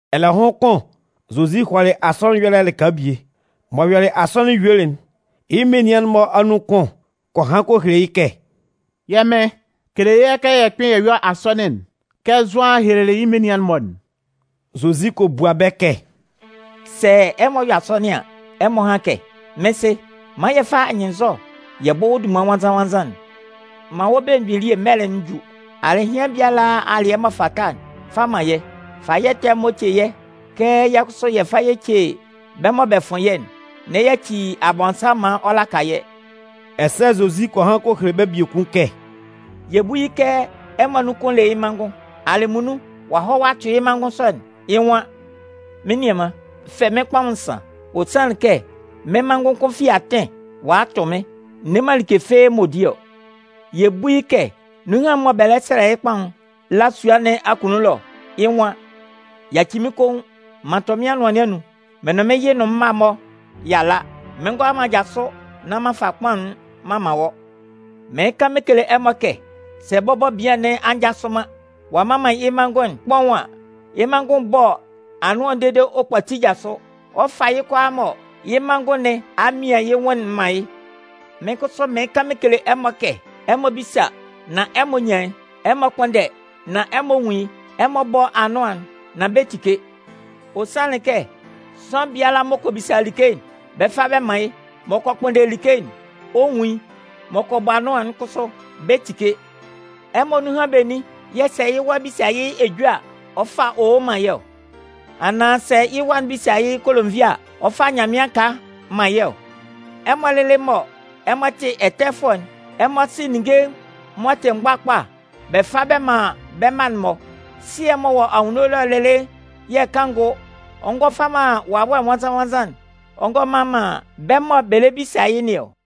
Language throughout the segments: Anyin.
Ɛlɛhʋn kʋn, Zozi hɔlɩ asɔnɩn ɛyɔlɛ lɩka bie. M'ɔ yɔlɩ asɔnɩn yuelɩ'n, yɩ́ menian'n-mɔ anun kʋn kɔ han kɔ hele yɩ́ kɛ: “Yɛ́ Mɩn kele yɛ́ kɛ bɛ kpɩn bɛ yɔ asɔnɩn'n kɛ Zʋan helelɩ yɩ́ menian'n-mɔ'n.” Zozi kɔ bua bɛ́ kɛ: “Sɛ ɛmɔ 'yɔ asɔnɩn an, ɛmɔ hán kɛ: Mɩ́n Sɩ, man yɛ fá anyɩnnzɔ yɛ bɔ́ wɔ́ dunman nwannzan-nwannzan'n. Man wɔ́ belemgbin elie mɛlɛ'n jú. Alɩhɩan biala alɩɛ m'ɔ fata'n, fa man yɛ́. Fa yɛ́ ɛtɛ'n-mɔ ce yɛ́ kɛ yɛ kʋsʋ yɛ fa yɛ ce bɛ́ mɔ bɛ fʋn yɛ́'n. N'ɛ yaci Abɔnsanmʋn maan ɔ laka yɛ́.” Ɛsɛ Zozi kɔ han kɔ hele bɛ́ biekun kɛ: “Yɛ bú yɩ́ kɛ ɛmɔ anun kʋn le yɩ́ manngʋn. Alɩmunnun ɔ'a hɔ a tʋ yɩ́ manngʋn sɔ'n, yɩ́ nwan: ‘Mɩ́n nianman, fɛ mɩ́n kpaʋn nsan. Ɔ sanlɩn kɛ mɩ́n manngʋn kʋn fi atɩn ɔ'a a tʋ mɩ́n, n ne man like mɔ ɔ 'di ɔ.’ “Yɛ bú yɩ́ kɛ nunhan'n mɔ bɛ lɛ sɛlɛ yɩ́ kpaʋn'n la yɩ́ sua nɩn akunnun ɛlɔ, yɩ́ nwan: ‘Yaci mɩ́n koun! M'an tʋ mɩ́n anʋan nɩn anun. Mɩ́n nʋn mɩ́n yɩ nʋn mɩ́n mma'n-mɔ y'a la. Mɩn ngʋala man jasʋ nán m'an fa kpaʋn'n m'an man wɔ́.’ Mɩɩn kan mɩn kele ɛmɔ kɛ, sɛ bɔbɔ bian nɩn a njasʋ man ɔ a mman man yɩ́ manngʋn'n kpaʋn an, yɩ́ manngʋn'n 'bɔ anʋan'n dede ɔ kpati jasʋ. Ɔ 'fa yɩ́ kʋalaa mɔ yɩ́ manngʋn nɩn a mian yɩ́ nwʋn'n man yɩ́. “Mɩ́n kʋsʋ mɩɩn kan mɩn kele ɛmɔ kɛ ɛmɔ bísa nán ɛmɔ 'nyan yɩ́. Ɛmɔ kpʋ́nndɛ nán ɛmɔ 'nwun yɩ́. Ɛmɔ bɔ́ anʋan'n nán bɛ 'tike. Ɔ sanlɩn kɛ sʋanlan biala m'ɔ kɔ bisa like'n, bɛ fa bɛ man yɩ́. M'ɔ kɔ kpʋnndɛ like'n, ɔ nwun yɩ́. M'ɔ kɔ bɔ anʋan'n kʋsʋ, bɛ tike. “Ɛmɔ anun benin yɛ̂ sɛ yɩ́ wa bisa yɩ́ ejue a, ɔ fa owo man yɩ́ ɔ? Anaan sɛ yɩ́ wa'n bisa yɩ́ kolonvia a, ɔ fa nyanmɩan aka man yɩ́ ɔ? Ɛmɔ lɩlɩ mɔ ɛmɔ tɩ ɛtɛfʋɛ'n, ɛmɔ sɩ ninnge m'ɔ tɩ mgbakpa bɛ fa bɛ man bɛ́ mma'n-mɔ. Sɩɛ'n m'ɔ wɔ anwunno ɛlɔ'n lɩlɩ yɛ̂ kanngʋ, ɔ ngɔ fa man Wawɛ Nwannzan-nwannzan'n ɔ ngɔ mman man bɛ́ mɔ bɛ lɛ bisa yɩ́ nɩn ɔ!”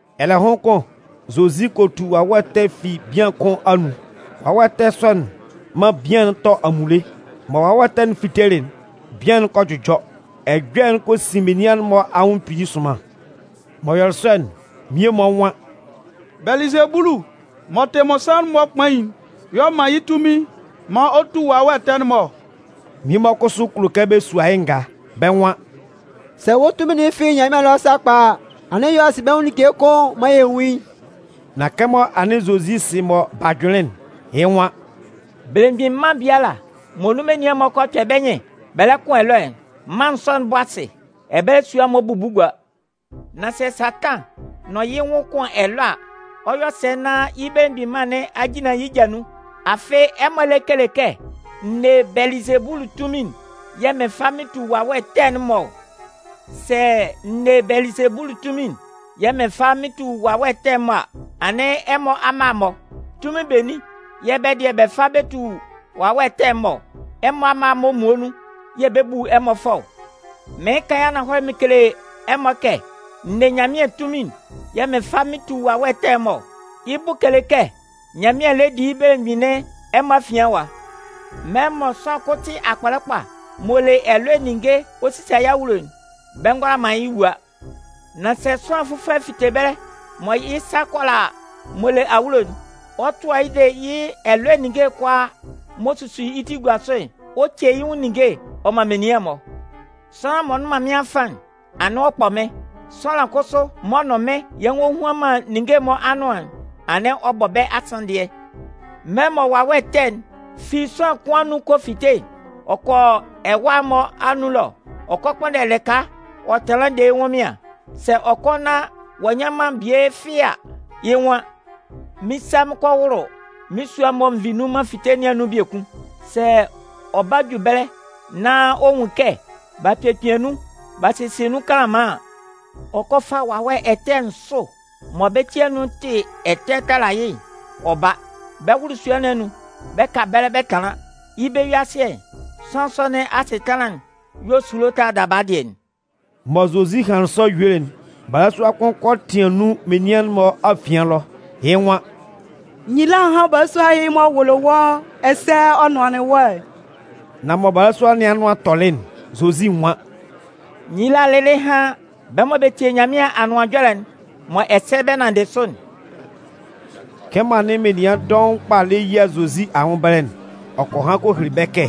Ɛlɛhʋn kʋn Zozi kɔ tu wawɛ ɛtɛ fi bian kʋn anun. Wawɛ ɛtɛ sɔ'n man bian'n tɔ amunle. Mɔ Wawɛ ɛtɛ'n fitelɩ'n, bian'n kɔ jʋjɔ. Ɛjɔlɛ'n kɔ sin menian'n-mɔ anwʋn kpili sʋnman. M'ɔ yɔlɩ sɔ'n, mmie-mɔ nwan: “Bɛlɩzebulu m'ɔ tɩ mmɔnsanmʋn'n-mɔ kpain'n y'ɔ man yɩ́ tunmin maan ɔ tu wawɛ ɛtɛ'n-mɔ ɔ” Mmie-mɔ kʋsʋ kulo kɛ bɛ sua yɩ́ ngaa. Bɛ́ nwan: “Sɛ wɔ́ tunmin'n fi Nyanmɩan ɛlɔ sakpa a, anɩn yɔ asinbɛnwʋn like kʋn maan yɛ nwún yɩ́.” Nan kɛmɔ anɩn Zozi sɩ mɔ b'a jʋnlɩn'n, yɩ́ nwan: “Belemgbin man biala mɔ nun menian'n-mɔ kpɛ bɛ́ nyɩn bɛ kʋn ɛlɔɛ'n, mân sɔ'n 'bɔ asɩ, ɛbɛlɛ sua'n-mɔ 'bubu gua. Nan sɛ Satan nʋn yɩ́ nwʋn kʋn ɛlɔ a, ɔ 'yɔ sɛ nán yɩ́ belemgbin mân nɩn a jinlan yɩ́ ja nun? Afɩ ɛmɔ lɛ kele kɛ n ne Bɛlɩzebulu tunmin'n yɛ̂ mɩn fa mɩn tu wawɛ ɛtɛ'n-mɔ ɔ. Sɛ n ne Bɛlɩzebulu tunmin'n yɛ̂ mɩn fa mɩn tu wawɛ ɛtɛ'n-mɔ a, anɩn ɛmɔ amma'n-mɔ, tunmin benin yɛ̂ bɛ́ dɩɛ bɛ fa bɛ tu wawɛ ɛtɛ'n-mɔ ɔ? Ɛmɔ amma'n-mɔ muonun yɛ̂ bɛ 'bu ɛmɔ fʋɔ ɔ. Mɩɩn kan yɩ́ ananhɔlɛ mɩn kele ɛmɔ kɛ n ne Nyanmɩan tunmin'n yɛ̂ mɩn fa mɩn tu wawɛ ɛtɛ'n-mɔ ɔ. Yɩ́ bʋ kele kɛ Nyanmɩan lɛ di yɩ́ belemgbin nɩn ɛmɔ afian ɛwa. “Mɛlɛ mɔ sʋanlan kʋn tɩ akpɔlɛ kpa, m'ɔ le ɛlɔɛ ninnge ɔ sisa yɩ́ awulo'n, bɛ ngʋala man yɩ́ wua. Nan sɛ sʋanlan fʋfɔlɛ fite ɛbɛlɛ mɔ yɩ́ sa kʋala m'ɔ le awulo'n, ɔ tʋa yɩ́ de yɩ́ ɛlɔɛ ninnge'n kʋalaa m'ɔ susu yɩ́ ti gua sʋ'n, ɔ ce yɩ́ nwʋn ninnge'n ɔ man menian'n-mɔ. “Sʋanlan m'ɔ nnʋn man mɩ́n afan'n, anɩn ɔ kpɔ mɩ́n. Sʋanlan kʋsʋ m'ɔ nʋn mɩ́n yɛ nwohuan man ninnge'n-mɔ anʋan'n, anɩn ɔ bɔ bɛ́ asanndɩɛ. “Mɛlɛ mɔ wawɛ ɛtɛ'n fi sʋanlan kʋn anun kɔ fite'n, ɔ kɔ ɛwâ'n-mɔ anun ɛlɔ ɔ kɔ kpʋnndɛ lɩka ɔ tanlan de yɩ́ ɛnwʋnmɩan. Sɛ ɔ kɔ nán ɔ'a nnyan man bie fɩ́ɩ́ a, yɩ́ nwan: ‘Mɩn 'sa mɩn kɔ wʋlʋ mɩn sua'n mɔ n vi nun m'an fite nɩn anun biekun.’ Sɛ ɔ ba ɔ ju ɛbɛlɛ nán ɔ nwun kɛ b'a kpekpian nun b'a sesie nun kanlanman an, ɔ kɔ fa wawɛ ɛtɛ nsʋ mɔ bɛ́ ti anun tɩ ɛtɛ tala yɩ́ ɔ ba. Bɛ wʋlʋ sua nɩn anun, bɛ ka ɛbɛlɛ bɛ tanlan. Yɩ́ bɛ-yue-asɩɛ, sʋanlan sɔ nɩn asɩtanlan'n yɔ esulo tala daba dɩɛ'n.” Mɔ Zozi hanlɩn sɔ yuelɩ'n, balasua kʋn kɔ tɩan nun menian'n-mɔ afian ɛlɔ. Yɩ́ nwan: “Nyila hán balasua ɛhɩ m'ɔ wʋlɩ wɔ́ ɛsɛ ɔ nʋanlɩn wɔ́'n!” Nan mɔ balasua nɩn anʋan tɔlɩ'n, Zozi nwan: “Nyila lɩlɩ hán bɛ́ mɔ bɛ tie Nyanmɩan Anʋan Ɛjɔlɛ'n mɔ ɛsɛ bɛ nanndɩ sʋ'n!” Kɛmɔ anɩn menian dɔʋn kpa lɛ yia Zozi anwʋn ɛbɛlɛ'n, ɔ kɔ han kɔ hele bɛ́ kɛ: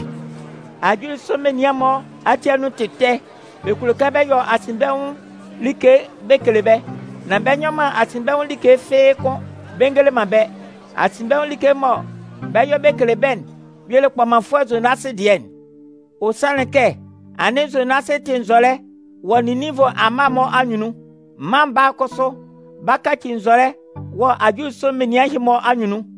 “Ajulisʋ menian'n-mɔ ati anun tɩ ɛtɛ. Bɛ kulo kɛ bɛ yɔ asinbɛnwʋn like bɛ kele bɛ́. Nan bɛ nyɔ man asinbɛnwʋn like fɩ́ɩ́ kʋn bɛ ngele man bɛ́. Asinbɛnwʋn like mɔ bɛ 'yɔ bɛ kele bɛ́'n, y'ɔ le kpɔmanfʋɛ Zonasɩ dɩɛ'n. Ɔ sanlɩn kɛ anɩn Zonasɩ tɩ nzɔlɛ wɔ Ninninvʋ amma'n-mɔ anyunnun. Mân Baa'n kʋsʋ 'ba kaci nzɔlɛ wɔ ajulisʋ menian ɛhɩ-mɔ anyunnun.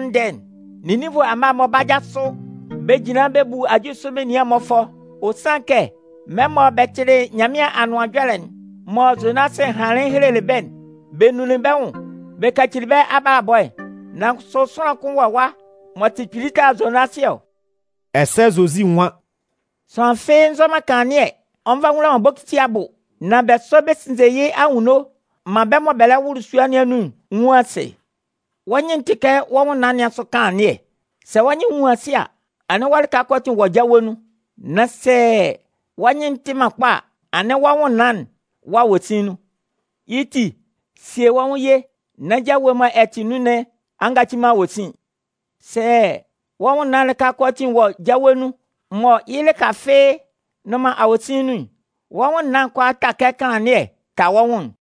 Cɩan mɔ Nyanmɩan 'bua mân'n ndɛɛ'n, Ninninvʋ amma'n-mɔ 'ba jasʋ bɛ jinlan bɛ bu ajulisʋ menian'n-mɔ fʋɔ. Ɔ sanlɩn kɛ mɛlɛ mɔ bɛ tɩlɩ Nyanmɩan Anʋan Ɛjɔlɛ'n mɔ Zonasɩ hanlɩn helelɩ bɛ́'n, bɛ nunlin bɛ́ nwʋn bɛ kacili bɛ́ abalabɔ'n. Nan kʋsʋ sʋanlan kʋn wɔ ɛwa m'ɔ tɩ kpili tala Zonasɩ ɔ!” Ɛsɛ Zozi nwan: “Sʋanlan fɩ́ɩ́ nzɔ kanlannɩɛ ɔ nva wula man bokiti abʋ, nan bɛ sɔ bɛ sinnze yɩ́ anwunno maan bɛ́ mɔ bɛ lɛ wʋlʋ sua nɩn anun'n nwun asɩ. Wɔ́ nyɩn'n tɩ kɛ wɔ́ nwʋnnaan nɩn asʋ kanlannɩɛ. Sɛ wɔ́ nyɩn'n nwun asɩ a, anɩn wɔ́ lɩka kʋalaatin wɔ́ jawe nun. Nan sɛ wɔ́ nyɩn'n tɩ man kpa a, anɩn wɔ́ nwʋnnaan'n wɔ awosin nun. Yɩ́ ti, sie wɔ́ nwʋn ye nán jawe'n mɔ ɛ tɩ nun nɩn a ngaci man awosin. Sɛ wɔ́ nwʋnnaan'n lɩka kʋalaatin wɔ jawe nun, mɔ yɩ́ lɩka fɩ́ɩ́ nnʋn man awosin nun'n, wɔ́ nwʋnnaan'n 'ta kɛ kanlannɩɛ'n ta wɔ́ nwʋn'n.”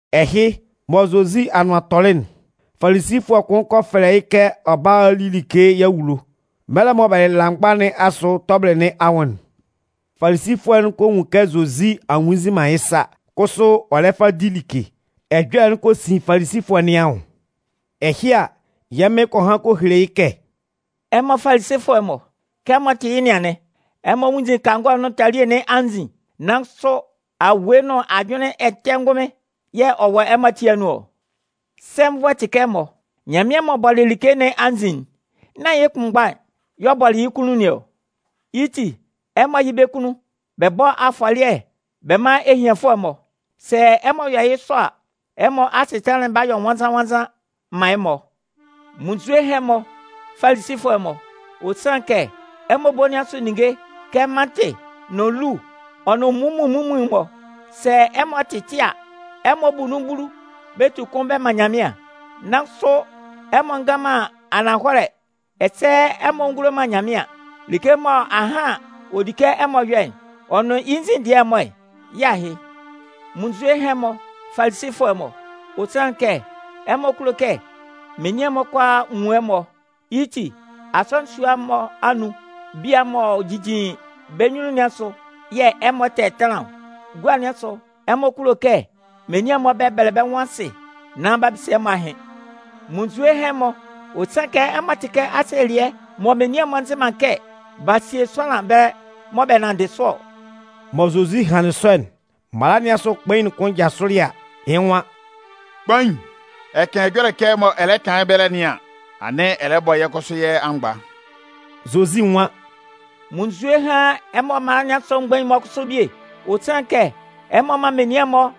Ɛhɩ, mɔ Zozi anʋan tɔlɩ'n, Falisifʋɛ kʋn kɔ fɛlɛ yɩ́ kɛ ɔ bála a li like yɩ́ awulo. Mɛlɛ mɔ bɛ lɩla mgba nɩn asʋ tɔbɩlɩ nɩn anwʋn'n, Falisifʋɛ'n kɔ nwun kɛ Zozi a nwunnzinman yɩ́ sa kʋsʋ ɔ le fa di like. Ɛjɔlɛ'n kɔ sin Falisifʋɛ nɩn anwʋn. Ɛhɩ a, yɛ́ Mɩn kɔ han kɔ hele yɩ́ kɛ: “Ɛmɔ Falisifʋɛ'n-mɔ, kɛ ɛmɔ tɩ yɩ́ nɩn anɩn. Ɛmɔ nwunnzin kangɔ'n nʋn talie nɩn anzin, nan kʋsʋ awue nʋn ajʋnlɩn ɛtɛ ngʋnmɩn y'ɔ wɔ ɛmɔ ati anun ɔ. Sɛnvʋɛ tɩ kɛ ɛmɔ! Nyanmɩan m'ɔ bɔlɩ like nɩn anzin'n, nán yɩ́ kʋnmgba'n y'ɔ bɔlɩ yɩ́ kunnun nɩn ɔ? Yɩ́ ti, ɛmɔ yɩ́ bɛ́ kunnun bɛ bɔ́ afɔlɩɛ bɛ mán ehianfʋɛ'n-mɔ. Sɛ ɛmɔ yɔ yɩ́ sɔ a, ɛmɔ asɩtanlan'n b'a yɔ nwannzan-nwannzan man ɛmɔ. “Munnzue hán ɛmɔ Falisifʋɛ'n-mɔ! Ɔ sanlɩn kɛ ɛmɔ ebo nɩn asʋ ninnge kɛ mantɩ nʋn lu ɔ nʋn munmuin munmuin'n-mɔ, sɛ ɛmɔ tɩtɩ a, ɛmɔ bu nun bulu bɛ tu kʋn bɛ man Nyanmɩan. Nan kʋsʋ ɛmɔ ngan man ananhɔlɛ ɛsɛ ɛmɔ ngulo man Nyanmɩan. Like mɔ ahan ɔ di kɛ ɛmɔ yɔ'n, ɔ nʋn yɩ́ nzin dɩɛ'n-mɔ'n, yɩ́ ahɩ. “Munnzue hán ɛmɔ Falisifʋɛ'n-mɔ! Ɔ sanlɩn kɛ ɛmɔ kulo kɛ menian'n-mɔ kʋalaa nwun ɛmɔ. Yɩ́ ti, asɔnɩn sua'n-mɔ anun bia'n-mɔ m'ɔ jijin bɛ́ nyunnun nɩn asʋ yɛ̂ ɛmɔ tɛtanlan ɔ. Gua nɩn asʋ, ɛmɔ kulo kɛ menian'n-mɔ bɛbɛlɛ bɛ́ nwʋn asɩ nán b'a bisa ɛmɔ ahɩn. “Munnzue hán ɛmɔ! Ɔ sanlɩn kɛ ɛmɔ tɩ kɛ asielɩɛ mɔ menian'n-mɔ nzɩ man kɛ b'a sie sʋanlan ɛbɛlɛ mɔ bɛ nanndɩ sʋ ɔ!” Mɔ Zozi hanlɩn sɔ'n, mala nɩn asʋ kpain'n kʋn jasʋlɩ a, yɩ́ nwan: “Kpain, ɛ kan ɛjɔlɛ kɛ mɔ ɛ lɛ kan yɩ́ ɛbɛlɛ nɩn an, anɩn ɛ lɛ bɔ yɛ́ kʋsʋ yɛ́ amgba!” Zozi nwan: “Munnzue hán ɛmɔ mala nɩn asʋ mgbain'n-mɔ kʋsʋ bie! Ɔ sanlɩn kɛ ɛmɔ man menian'n-mɔ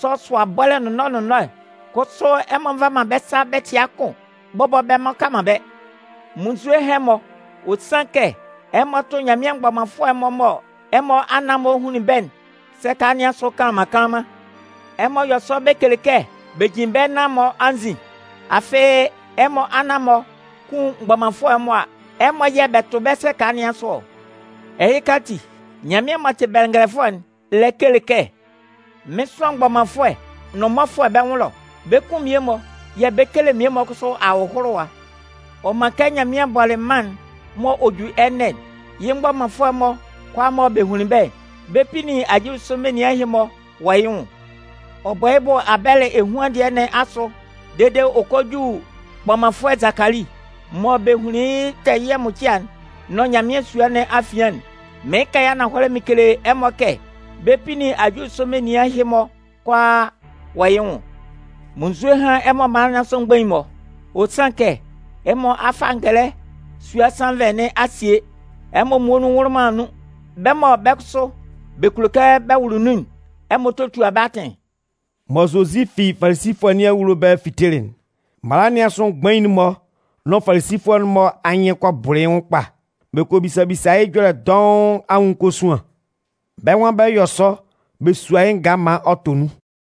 sɔsʋa bɔ́lɛ nʋnnɔɛ nʋnnɔɛ, kʋsʋ ɛmɔ nva man bɛ́ sa bɛtɩa kʋn bɔbɔ bɛ mmʋka man bɛ́. “Munnzue hán ɛmɔ! Ɔ sanlɩn kɛ ɛmɔ tʋ Nyanmɩan mgbɔmanfʋɛ'n-mɔ mɔ ɛmɔ anan-mɔ hunlin bɛ́'n sɛka nɩn asʋ kanlanman kanlanman! Ɛmɔ yɔ sɔ bɛ kele kɛ bɛ jin bɛ́ nan-mɔ anzin. Afɩ ɛmɔ anan-mɔ kun mgbɔmanfʋɛ'n-mɔ a, ɛmɔ yɛ̂ bɛ tʋ bɛ́ sɛka nɩn asʋ ɔ! Ɛhɩka ati, Nyanmɩan m'ɔ tɩ bɛngɛlɛfʋɛ'n lɛ kele kɛ: ‘Mɩn 'sʋan mgbɔmanfʋɛ nʋn mmɔfʋɛ bɛ́ nwʋn ɛlɔ. Bɛ 'kun mmie-mɔ yɛ̂ bɛ 'kele mmie-mɔ kʋsʋ ahʋlʋwa.’ Ɔ man kɛ Nyanmɩan bɔlɩ mân'n mɔ ɔ 'ju ɛnɛ'n, yɩ́ mgbɔmanfʋɛ'-mɔ kʋalaa mɔ b'a hun bɛ́'n, bɛ 'pinnin ajulisʋ menian ɛhɩ-mɔ wɔ yɩ́ nwʋn. Ɔ bɔ yɩ́ bʋ Abɛlɩ ehuan dɩɛ nɩn asʋ dede ɔ kɔ ju kpɔmanfʋɛ Zakali, mɔ bɛ hunlin yɩ́ tɛɛyɩɛ mʋcɩa'n nʋn Nyanmɩan sua nɩn afian'n, mɩɩn kan yɩ́ ananhɔlɛ mɩn kele ɛmɔ kɛ, bɛ 'pinnin ajulisʋ menian ɛhɩ-mɔ kʋalaa wɔ yɩ́ nwʋn. “Munnzue hán ɛmɔ mala nɩn asʋ mgbain'n-mɔ! Ɔ sanlɩn kɛ ɛmɔ a fa ngɛlɛ sua sannvɛ nɩn a sie. Ɛmɔ muonun nwʋlʋ man nun. Bɛ́ mɔ bɛ́ kʋsʋ bɛ kulo kɛ bɛ wʋlʋ nun'n, ɛmɔ totua bɛ́ atɩn.” Mɔ Zozi fi Falisifʋɛ nɩn awulo ɛbɛlɛ fitelɩ'n, mala nɩn asʋ mgbain'n-mɔ nʋn Falisifʋɛ'n-mɔ anyɩn kɔ bʋlʋ yɩ́ nwʋn kpa. Bɛ kɔ bisa bisa yɩ́ ɛjɔlɛ dɔʋn anwʋn kosuan. Bɛ́ nwan bɛ 'yɔ sɔ bɛ sua yɩ́ ngaa maan ɔ tɔ nun.